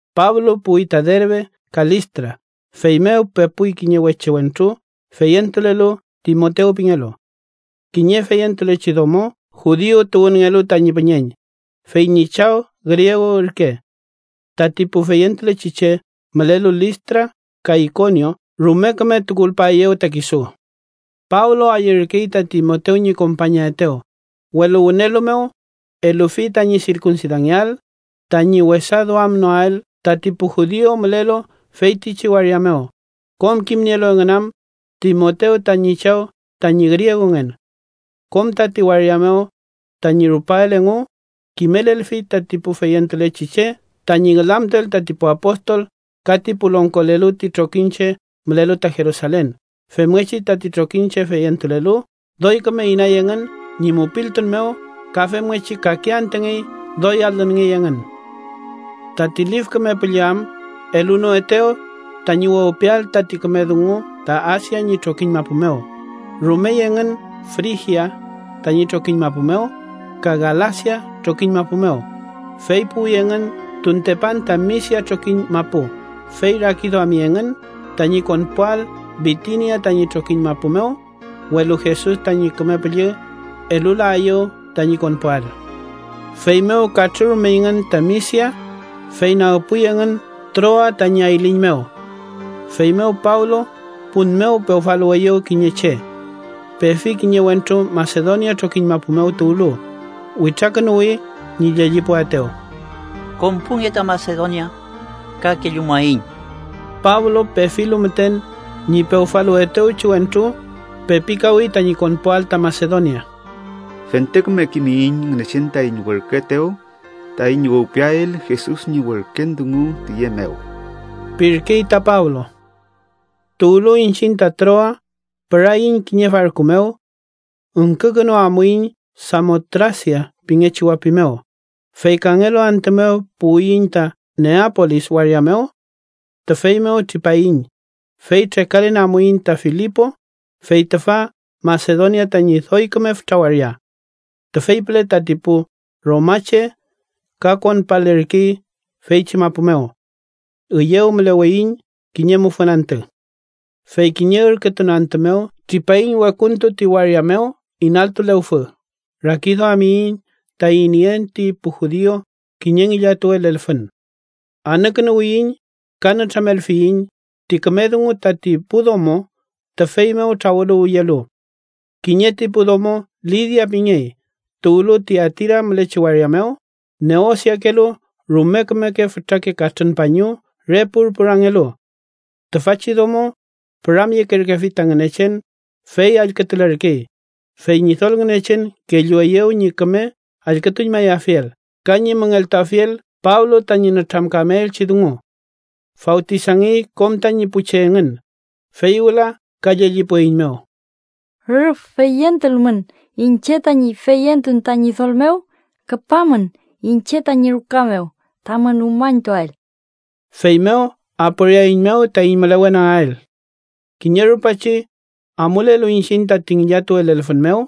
Pablo puwi ta Derbe ka Listra, feymew pepuy kiñe weche wentru feyentulelu Timotew pingelu. Kiñe feyentulechi domo judiu tuwünngelu tañi püñeñ, fey ñi chaw griegu ürke. Tati pu feyentulechi che mülelu Listra ka Ikonio rume küme tukulpaeyew ta kisu. Pablo ayürkey ta Timotew ñi kompañaetew, welu wünelu mew elufi tañi sirkunsidangeael tañi wesa duamnoael tati pu judiu mülelu feytichi waria mew, kom kimnielu engün am Timotew tañi chaw tañi griegungen. Kom tati waria mew tañi rupael engu, kimelelfi tati pu feyentulechi che tañi ngülamtuel tati pu apostol ka ti pu longkolelu ti trokiñche mülelu ta Jerusalen. Femngechi tati trokiñche feyentulelu doy küme inay engün ñi mupiltun mew ka femngechi kake antüngey doy alünngey engün. Tati Lif Küme Püllü am elunoetew tañi wewpiael tati küme dungu ta Asia ñi trokiñ mapu mew, rumey engün Frigia tañi trokiñ mapu mew ka Galasia trokiñ mapu mew, fey puwi engün tuntepan ta Misia trokiñ mapu. Fey rakiduami engün tañi konpuael Bitinia tañi trokiñ mapu mew, welu Jesus tañi Küme Püllü elulaeyew tañi konpuael. Feymew katrürumeyngün ta Misia, fey nagpuy engün Troa tañi ayliñ mew. Feymew Pablo pun mew pewfaluweyew kiñe che. Pefi kiñe wentru Masedonia trokiñ mapu mew tuwlu, witrakünuwi ñi llellipuaetew: “Konpunge ta Masedonia ka kellumuaiñ.” Pablo, pefilu müten ñi pewfaluwetewchi wentru, pepikawi tañi konpuael ta Masedonia. “Fente küme kimiyiñ Ngünechen taiñ werküetew taiñ wewpiael Jesus ñi werken dungu tiye mew” pirkey ta Pablo. Tuwlu iñchiñ ta Troa, püraiñ kiñe farku mew. Üngkükünu amuiñ Samotrasia pingechi wapi mew, fey kangelu antü mew puwiyiñ ta Neapolis waria mew. Tüfey mew tripaiñ, fey trekalen amuiñ ta Filipo, fey tüfa Masedonia tañi doy küme fütra waria. Tüfey püle tati pu romache ka konpalerkey feychi mapu mew. Üyew müleweiñ kiñe mufün antü. Fey kiñe ürkütun antü mew tripaiñ wekuntu ti waria mew inaltu lewfü, rakiduamiyiñ tañi nien ti pu judiu kiñe ngillatuwe lelfün. Anükünuwiyiñ ka nütramelfiyiñ ti küme dungu tati pu domo tüfey mew trawüluwyelu. Kiñe ti pu domo Lidia pingey, tuwlu Tiatira mülechi waria mew neosiakelu rume kümeke fütrake katrün pañu re purpurangelu. Tüfachi domo püramyekerkefi ta Ngünechen fey allkütulerkey, fey Ñidol Ngünechen kellueyew ñi küme allkütuñmayafiel ka ñi müngeltuafiel Pablo tañi nütramkameelchi dungu. Fawtisangey kom tañi pu che engün, fey wüla ka llellipueiñmew: —Rüf feyentulmun iñche tañi feyentun ta Ñidol mew, küpamün iñche tañi ruka mew tamün umañtuael. Feymew aporiaeiñmew taiñ mülewenagael. Kiñe rupachi, amulelu iñchiñ tati ngillatuwe lelfün mew,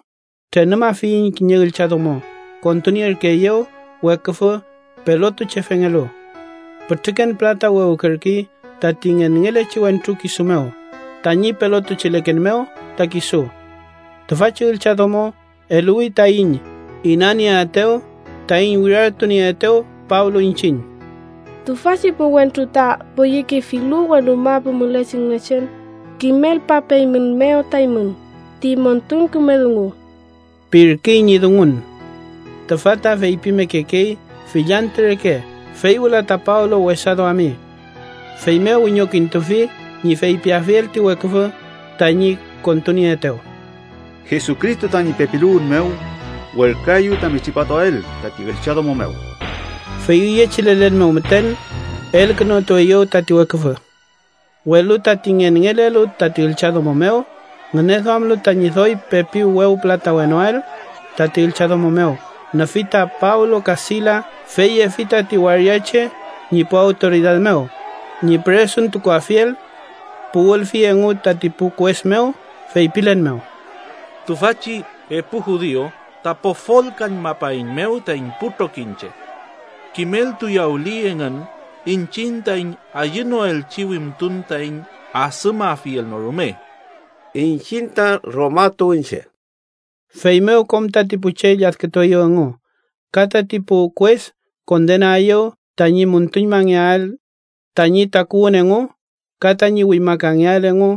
trenumafiyiñ kiñe üllchadomo kontunierkeeyew weküfü pelotuchefengelu. Pütrüken pülata wewkerkey tati ngenngeelchi wentru kisu mew tañi pelotucheleken mew ta kisu. Tüfachi üllchadomo eluwi taiñ inanieaetew taiñ wirartunieetew Pablo iñchiñ: —¡Tüfachi pu wentru ta poyekefilu wenu mapu mülechi Ngünechen, kimelpapeeymünmew ta eymün ti montun küme dungu! ―pirkey ñi dungun. Tüfa ta feypimekekey fill antü reke, fey wüla ta Pablo wesa duami. Feymew wiñokintufi ñi feypiafiel ti weküfü tañi kontunieetew: —Jesucristo tañi pepiluwün mew, werküaeyu tami tripatuael tati üllchadomo mew. Fey üyechi lelen mew müten elkünutueyew tati weküfü. Welu tati ngenngelelu tati üllchadomo mew, ngüneduamlu tañi doy pepi wewpülatawenoael tati üllchadomo mew, nüfi ta Pablo ka Silas, fey yefi tati waria che ñi pu awtoridad mew ñi püresuntukuafiel. Puwülfi engu tati pu kues mew, feypilen mew: —Tüfachi epu judiu ta pofolkañmapaeiñmew taiñ pu trokiñche. Kimeltuyawüli engu iñchiñ taiñ ayünoelchi wimtun taiñ adümafiel no rume. Iñchiñ ta Roma tuwünche. Feymew kom tati pu che lladkütueyew engu, ka tati pu kues kondenaeyew tañi müntuñmangeael tañi takuwün engu ka tañi wimakangeael engu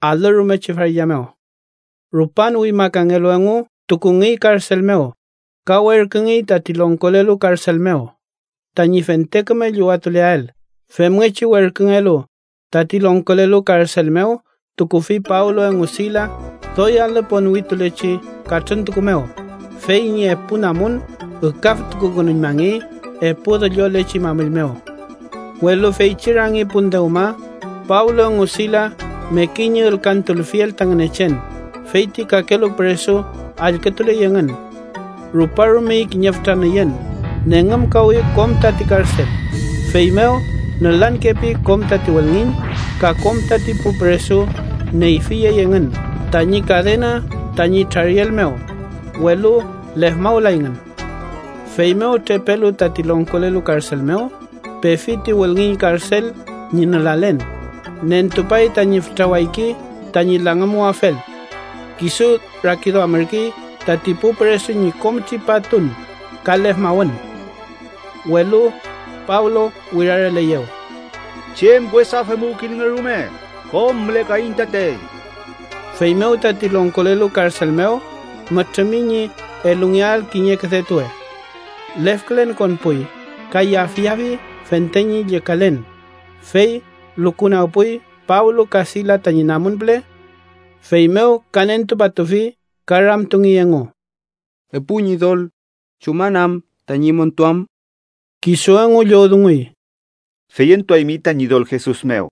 alü rumechi farilla mew. Rupan wimakangelu engu, tukungey karsel mew ka werküngey tati longkolelu karsel mew tañi fente küme llüwatuleael. Femngechi werküngelu, tati longkolelu karsel mew tukufi Pablo engu Silas doy alü ponwitulechi katrüntuku mew, fey ñi epu namun ükaftukukünuñmangey epu düllolechi mamüll mew. Welu feychi rangi pun dewma, Pablo engu Silas mekey ñi ülkantulfiel ta Ngünechen, fey ti kakelu püresu allkütuley engün. Ruparumey kiñe fütra nüyün. Nengümkawi kom tati karsel. Feymew nülankepi kom tati wülngiñ, ka kom tati pu püresu neyfiyey engün tañi kadena tañi trariel mew, welu lefmawlayngün. Feymew trepelu tati longkolelu karsel mew, pefi ti wülngiñ karsel ñi nülalen, nentupay tañi fütra wayki tañi langümuwafel. Kisu rakiduamürkey tati pu püresu ñi kom tripatun ka lefmawün. Welu Pablo wirareleyew: —¡Chem wesa femuwkilnge rume! ¡Kom mülekaiñ tatey! Feymew tati longkolelu karsel mew mütrümi ñi elungeael kiñe küdetuwe. Lefkülen konpuy ka yafyafi fente ñi llükalen, fey lukunagpuy Pablo ka Silas tañi namun püle. Feymew ka nentupatufi ka ramtungey engu: —Epu ñidol, ¿chuman am tañi montuam? Kisu engu llowdunguy: —Feyentuaymi ta Ñidol Jesus mew.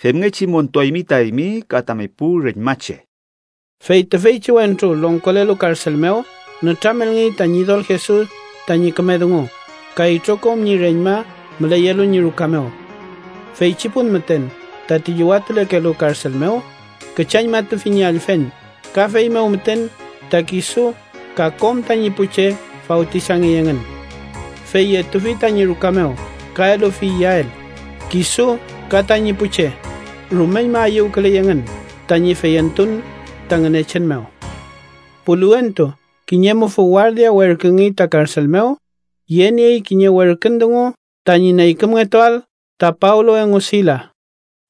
Femngechi montuaymi ta eymi ka tami pu reñmache. Fey tüfeychi wentru longkolelu karsel mew nütramelngey ta Ñidol Jesus tañi küme dungu ka itrokom ñi reñma müleyelu ñi ruka mew. Feychi pun müten tati llüwatulekelu karsel mew küchañmatufi ñi allfen ka feymew müten ta kisu ka kom tañi pu che fawtisangey engün. Fey yetufi tañi ruka mew ka elufi iyael. Kisu ka tañi pu che rumeñma ayüwküley engün tañi feyentun ta Ngünechen mew. Puliwentu, kiñe mufü wardia werküngey ta karsel mew, yeniey kiñe werkün dungu tañi neykümngetuael ta Pablo engu Silas.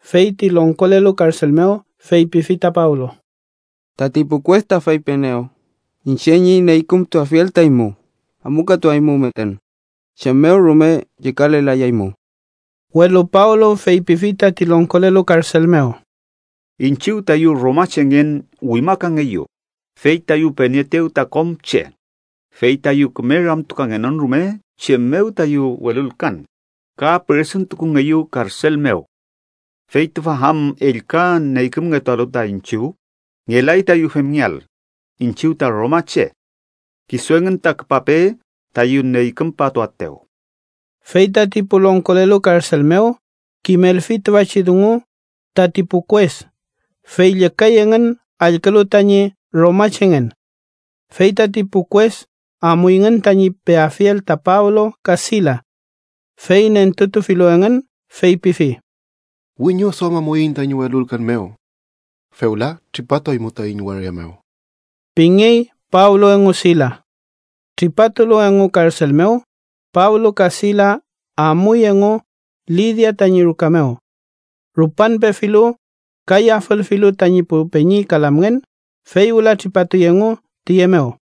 Fey ti longkolelu karsel mew feypifi ta Pablo: —Tati pu kues ta feypienew iñche ñi neykümtuafiel ta eymu. Amukatuaymu müten. Chem mew rume llükalelayaymu. Welu Pablo feypifi tati longkolelu karsel mew: —Iñchiw, tayu romachengen wimakangeyu, fey tayu penieetew ta kom che, fey tayu küme ramtukangenon rume chem mew tayu welulkan, ka püresuntukungeyu karsel mew. ¿Fey tüfa am ellka neykümngetualu ta iñchiw? ¡Ngelay tayu femngeael iñchiw ta romache! Kisu engün ta küpape tayu neykümpatuaetew. Fey tati pu longkolelu karsel mew kimelfi tüfachi dungu tati pu kues, fey llükay engün allkülu tañi romachengen. Fey tati pu kues amuyngün tañi peafiel ta Pablo ka Silas. Fey nentutufilu engün, feypifi: —Wiñoduamamuiñ taiñ welulkan mew. Fewla tripatuaymu taiñ waria mew ―pingey Pablo engu Silas. Tripatulu engu karsel mew, Pablo ka Silas amuy engu Lidia tañi ruka mew. Rupan pefilu ka yafülfilu tañi pu peñi ka lamngen, fey wüla tripatuy engu tiye mew.